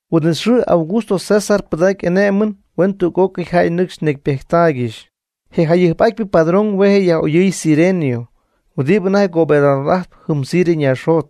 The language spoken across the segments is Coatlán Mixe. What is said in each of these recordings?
Huin'it xɨɨ Augusto César pɨdacy y'ané'mɨn huen tüg'ócɨy jäy nɨcxy necypejttaaygɨxy. Je jayɨjp'atypɨ padrón hue' je'yaj'oyɨɨy Cirenio huɨdibɨ anajty gobernador'ajtp jɨm Siria ñaaxjot.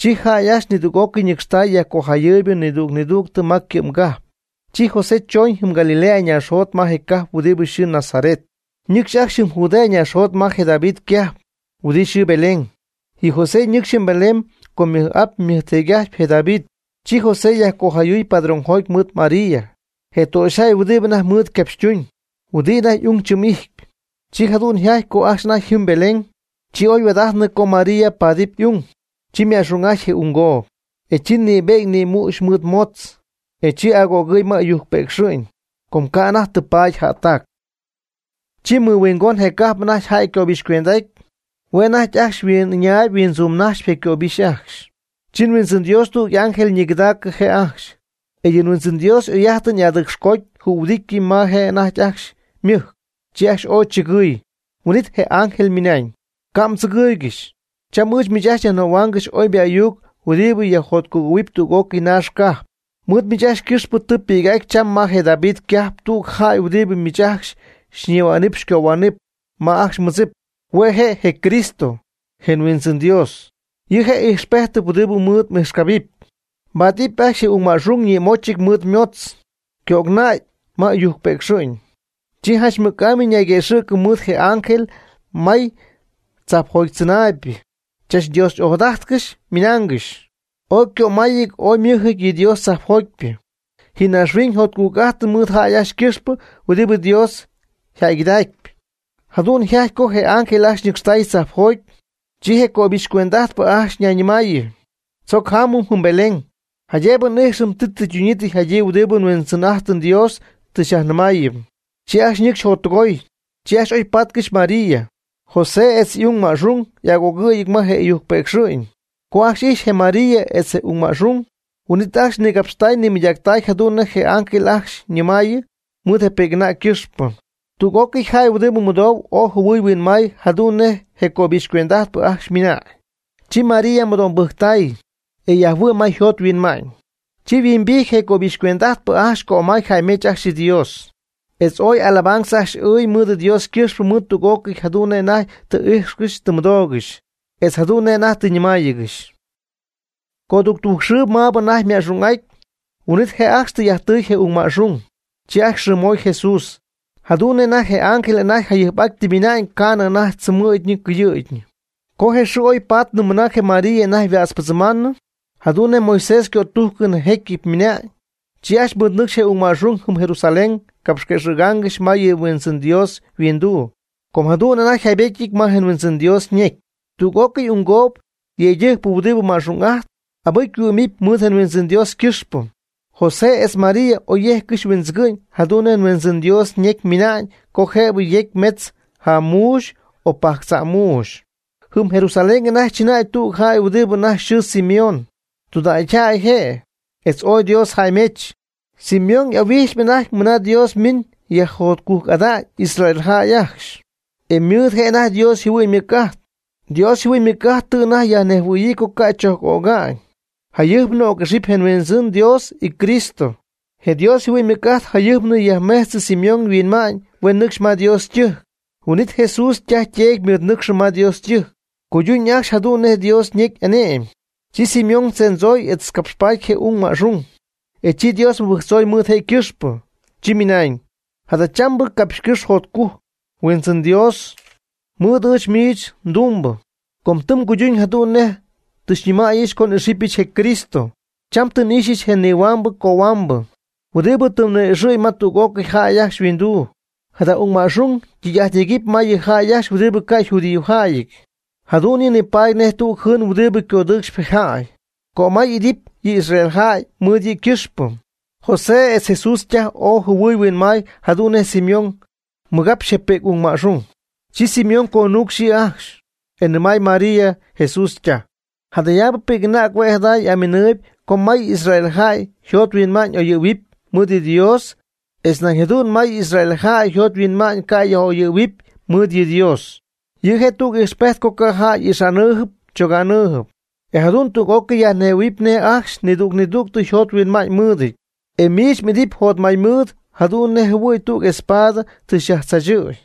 Chi jäy ajcxy nidüg'ócɨy ñɨcxtay yajcojayɨɨybɨ nidüg nidüg ma ycɨ'mgajp. Chi José chooñ jɨm Galilea naaxjot ma je cajp huɨdi yxɨɨ Nazaret, ñɨcxy ajcxy jɨm Judea naaxjot ma je David ycajp, huɨdi yxɨɨ Belén. Yɨ José ñɨcxy jɨm Belén com ymɨj'ap'ajtpy ymɨjteedy'ajtpy je David. Chi José yajcojayɨɨy padrónjoty mɨɨd María, je töxyjäy huɨdibɨ anajty ymɨɨd capxytuñ, huɨdi anajty ung tzɨm'ijtp. Chi jadu'n yjajty co ajcxy anajty yjɨ́mɨty Belén, chi oyhuaad'aty co María paadɨpy y'ung. Chi yma'xung'ajty je unggoob, e chi nïbe'ñ nïmüxy mɨɨd ymotz, e chi agögɨɨy ma ɨyujc pëcxɨ'ñ, co ca' anajty tɨ paady jättac. Chi mɨhuingon je cajp anajty jäy ycöbixycuend'aty. Hue' anajty ajcxy yhuin'ɨñaayb huintzuumnajxyp je' ycöbixy ajcxy. Chi Huindzɨn Dios tüg y'ángel ñigɨdaacɨ je' ajcxy, e yɨ Huindzɨn Dios y'oy'ájtɨn y'adɨcxcoody jühuɨdity ma je' anajty ajcxy ymɨjc, chi ajcxy ooy chɨgɨɨy. Huin'it je ángel ymɨnañ: ―Ca' mdzɨgɨɨygɨxy, cham ɨɨch miich nyajnɨmaaygɨxy oybɨ ayuc huɨdibɨ yajjotcugɨ̈huɨpy tüg'ócɨy naax cajp. Mɨɨd miich ajcxy ycɨxpɨ tɨ ypi'c'aty cham ma je David ycajp tüg jäy huɨdibɨ miich ajcxy xyñihuänaam xycohuänaam ma ajcxy mmɨdzip. Hue' je' je CRISTO, je Huindzɨn Dios. Yɨ' je' ijxpéjtɨp huɨdi mɨɨd m'ijxcabɨpy. Mbáadɨpy ajcxy je ung ma'xung ñïmóchɨty mɨɨd ymotz, ycöcnäy ma ɨyujc pëcxɨ'ñ. Chi janch mɨc'amy ñayguëxɨ̈cɨ mɨɨd je ángel may yɨ tzajpjotychɨnaaybɨ, chach Dios ojadájtcɨxy ymɨnáangɨxy: ¡Ooy ycömáyɨty ooy ymɨ́jɨty yɨ Dios tzajpjotypɨ, ji naaxhuiñ jotcujc'ajt mɨɨd jäy ajcxy ycɨxpɨ huɨdibɨ Dios yjäygɨdacpy! Jadu'n yjajty co je ángel ajcxy ñɨcxtay tzajpjoty, chi je cöbixy cuend'ajtpɨ ajcxy ñayñɨmayɨ: ―Tzoc jámɨm jɨm Belén, jaydëbɨ n'íjxɨm ti tɨ ytunyii tɨ yjadyii huɨdibɨ nHuindzɨn'ájtɨm Dios tɨ xyajnɨmáayɨm. Chi ajcxy ñɨcxy jottɨgoy, chi oy pátcɨxy María, José etz je ung ma'xung y'agögɨ̈yɨty ma je ɨyujc pëcxɨ'ñ. Co ajcxy ijxy je María etz je ung ma'xung, huin'it ajcxy nigapxtay nimɨydactay jadu'n nej je ángel ajcxy ñɨmayɨ mɨɨd je pi'c'anäg ycɨxpɨ. Tüg'ócɨy jäy huɨdi mɨdou ooy jɨhuɨy huinmay jadu'n nej je cöbixycuend'ajtpɨ ajcxy ymɨnañ. Chi María mɨdo'mbɨjctay, e yajhuɨ'my ma yjot yhuinma'ñ. Chi yhuimbijty je cöbixycuend'ajtpɨ ajcxy cömay jäymech ajcxy yɨ Dios, etz ooy alabanza ajcxy ɨɨy mɨɨd Dios ycɨxpɨ mɨɨd tüg'ócɨy jadu'n nej anajty tɨ íjxcɨxy tɨ mɨdóogɨxy, etz jadu'n nej anajty tɨ ñɨmáayɨgɨxy. Coductujc xɨɨ maabɨ anajty yma'xung'aty, huin'it je' ajcxy tɨy'ajttɨy je ung ma'xung. Chi ajcxy yxɨɨmoy JESUS, jadu'n nej je ángel anajty jayɨjp tɨ ymɨna'ñ ca'nɨ anajty chɨmɨ̈gyii ycɨyɨ̈gyii. Co je xɨɨ oypaatnɨ mɨna je María anajty yhuätzpɨdzɨmaamnɨ, jadu'n nej Moisés ycötújcɨn je jécyɨp ymɨnañ. Chi ajcxy mɨɨdnɨcxy je ung ma'xung jɨm Jerusalén capxquëxɨ̈gaangɨxy ma yɨ Huindzɨn Dios yhuinduu. Com jadu'n anajty yjaybétyɨty ma Huindzɨn Dios ñecy: Tüg'ócɨy unggoob yëydɨjcpɨ huɨdi ma'xung'ajtp, abɨcy yhuɨ́'mɨpy mɨɨd je Huindzɨn Dios ycɨxpɨ. José etz María oy yéjccɨxy huindzɨgɨ'ñ jadu'n nej Huindzɨn Dios ñecy ymɨna'ñ co jëbɨ yecy metzc jam muuxy o pajctza'm muuxy. Jɨm Jerusalén anajty chɨnäy tüg jäy huɨdi anajty yxɨɨ Simeón, tudägyjäy je', etz ooy Dios jäymech. Simeón y'ahuijxyp anajty mɨna Dios miñ yajjotcujc'ada'ñ Israeljäy ajcxy, e mɨɨd je' anajty Dios yjɨhuɨ'ñ ymɨc'ajt. Dios yjɨhuɨ'ñ ymɨc'ajt tɨ anajty yajnejhuɨ̈yii co ca' chojc öga'ñ, jayɨjpnɨ oc'ixɨpy je Huindzɨn Dios yCristo. Je Dios yjɨhuɨ'ñ ymɨc'ajt yajmin yajmejtzɨ Simeón yhuinma'ñ huen nɨcxy ma Dios ytɨjc; huin'it Jesús ytaj yteedy ymɨɨdnɨcxɨ ma Dios ytɨjc, cuyduñ ajcxy jadu'n nej Dios ñecy y'ane'my. Chi Simeón tzendzoy etz capxpaady je ung ma'xung, e chi Dios mɨbɨjctzoy mɨɨd je' ycɨxpɨ, chi ymɨnañ: Jadachambɨ capxcɨ́x jotcujc, Huindzɨn Dios, mɨɨd ɨɨch miich mdumbɨ, com tɨ mguyduñ jadu'n nej tɨ xyñɨmäyɨch co n'ixɨpyɨch je Cristo. Cham tɨ n'ixyɨch je nihuambɨ cohuambɨ, huɨdibɨ tɨ mni'ixɨ̈y ma tüg'ócɨy jäy ajcxy yhuinduu. Jada ung ma'xung ytɨy'ajt yegɨp ma yɨ jäy ajcxy huɨdi ca' yjudiojäyɨty. Jadu'n yɨ' nipaady nej tüg jɨɨn huɨdi codɨɨcxp je jäy. Cömay y'idɨpy yɨ Israel jäy mɨɨd yɨ' ycɨxpɨ. José etz Jesús ytaj ooy jɨhuɨɨy huinmaay jadu'n nej Simeón ñigapxy je pi'c ma'xung. Chi Simeón conuucx yɨ' ajxcy, e nɨmay María, Jesús ytaj: ―Jadayaabɨ pi'c'anäg hue' jada aminɨ̈y co may Israel jäy yjothuinma'ñ yaj'oyɨ̈huɨpy mɨɨd yɨ Dios etz nañ jadu'n may Israel jäy yjothuinma'ñ ca' yaj'oyɨ̈huɨpy mɨɨd yɨ Dios. Yɨ' je' tüg ijxpejt co ca' jäy y'ixa'nɨɨyb choga'nɨɨyb, e jadu'n tüg'ócɨy yajnejhuɨ̈huɨpy nej ajcxy nidüg nidüg yjothuinma'ñ mɨɨdɨty. E miich m'idɨpy jotmaymɨɨd jadu'n nejɨhuɨ̈y tüg espada tɨ xyajtzaachɨ̈y.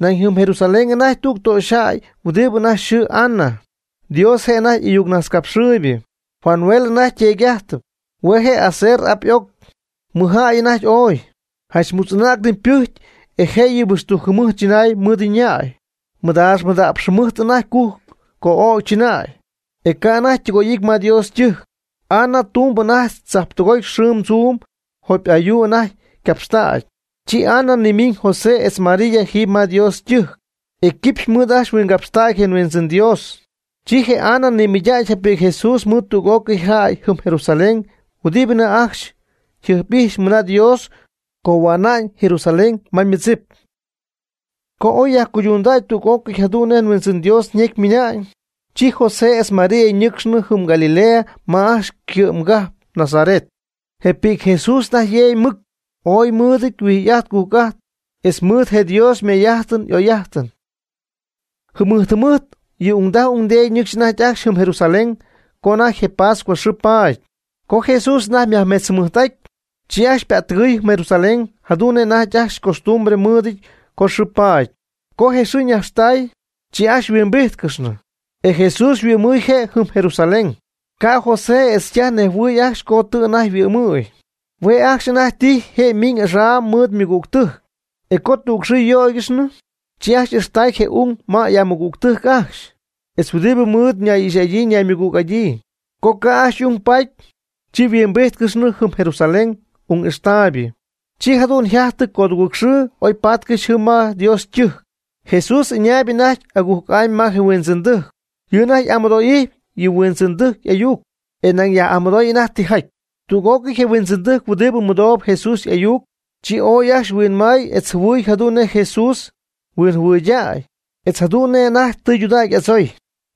Nañ jɨm Jerusalén anajty tüg töxyjäy huɨdibɨ anajty yxɨɨ Ana, Dios je' anajty y'ayucnajtzcapxɨɨybɨ. Fanuel anajty yteedy'ajtpy, hue' je' Aser y'ap y'oc, mɨj jäy anajty ooy. Janch mutz'anägnɨ ypɨjcy e jëyɨ huixtujc jɨmɨjt chɨnay mɨɨd yña'y, mada'px mɨdaax jɨmɨjt anajty cujc co'ögy chɨnäy, e ca' anajty ytɨgoy'ity ma Dios ytɨjc. Ana ytumb anajty tzajtɨgoty xɨɨm tzuum jopy ayuu anajty ycapxtägy. Chi Ana nimiñ José etz María jiiby ma Dios ytɨjc, e quipxy mɨɨd ajcxy huingapxtacy je Huindzɨn Dios. Chi je Ana nimɨydacy je pi'c Jesús mɨɨd tüg'ócɨy jäy jɨm Jerusalén huɨdi anajty ajcxy jɨjp'ijxp mɨna Dios cohua'na'ñ Jerusalén ma ymɨdzip. Co oy yajcuydundäy tüg'ócɨy jadu'n nej je Huindzɨn Dios ñecy ymɨna'ñ, chi José etz María ñɨ́cxcɨxnɨ jɨm Galilea ma ajcxy ycɨ'mgajp Nazaret. Je pi'c Jesús anajty yeegy mɨc ooy mɨɨd huijy'ajt cujc'ajt, etz ymɨɨd je' Dios ymay'ájtɨn y'oy'ájtɨn. Jɨmɨjt jɨmɨjt yɨ ungdaj ungdeedy ñɨcxy anajty ajcxy jɨm Jerusalén co anajty je Pascua xɨɨ paady. Co Jesús anajty ymajmetzjɨmɨjt'ajty, chi ajcxy ypättɨgɨɨy jɨm Jerusalén jadu'n anajty ajcxy costumbre mɨɨdɨty co xɨɨ paady. Co je xɨɨ ñaxtäy, chi ajcxy huimbíjtcɨxnɨ, e Jesús yhuɨ'mɨɨy je' jɨm Jerusalén. Ca' José etz ytaj nejhuɨɨy ajcxy co tɨ anajty yhuɨ'mɨy. Hue' ajcxy anajty tijy je' ymiñ axaam mɨɨd ymɨgügtɨjc. Co tüg xɨɨ yöygɨxnɨ, chi ajcxy ixtay je' y'ung ma y'amɨgügtɨjc ajcxy, etz huɨdi mɨɨd ñay'ixy'adyii ñaymɨgüg'adyii. Co ca' ajcxy y'ung paady, chi yhuimbíjtcɨxnɨ jɨm Jerusalén ung ixtaaybɨ. Chi jadu'n yjajty codugɨɨg xɨɨ oypaatcɨxy jɨm ma Dios ytɨjc, Jesús y'ɨñäy anajty agujc'amy ma je huindzɨndɨjc. Yɨ' anajty y'amɨdo'ijtyp yɨ huindzɨndɨjc y'ayuc, e nañ yaj'amɨdooy anajty tijaty. Tüg'ócɨy je huindzɨndɨjc huɨdibɨ mɨdou Jesús y'ayuc, chi ooy ajcxy huinmay etz jɨhuɨy jadu'n nej je Jesús huinjɨhuɨydäy etz jadu'n nej anajty tɨydudägy y'adzooy.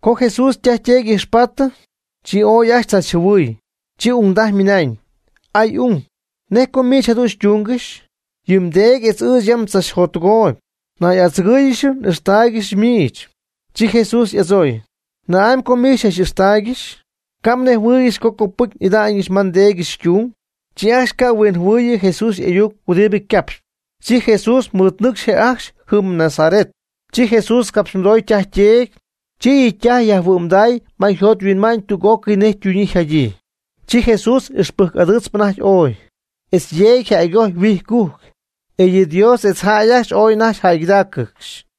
Co Jesús ytaj yteedy y'ijxpatɨ, chi ooy ajcxy tzachjɨhuɨɨy. Chi ungdaj ymɨnañ: ―Aay ung, ¿nej co miich jadu'n xytúngɨxyɨch? Yɨ mdeedy etz ɨɨch yam tzachjottɨgooyb nay'adzɨgɨ̈yiijɨch n'ixtáaygɨxɨch miich. Chi Jesús y'adzooy: ―¿Na'amy co miich xy'ixtáaygɨxyɨch? ¿Ca' mnejhuɨɨygɨxy co copɨty n'ida'ñɨch ma nDéedyɨch ytung? Chi ajcxy ca' huinjɨhuɨɨyɨ Jesús y'ayuc huɨdibɨ ycapxy. Chi Jesús mɨɨd nɨcxy je' ajcxy jɨm Nazaret. Chi Jesús capxymɨdoy ytaj yteedy. Chi yɨ' ytaj yajhuɨ'mday ma yjot yhuinma'ñ tüg'ócɨy nej ytunyii yjadyii. Chi Jesús ixpɨjc'adɨɨtzp anajty ooy, etz yeegy yjäygojy huijycujc. E yɨ Dios etz jäy ajcxy ooy anajty jäygɨdaaccɨxy.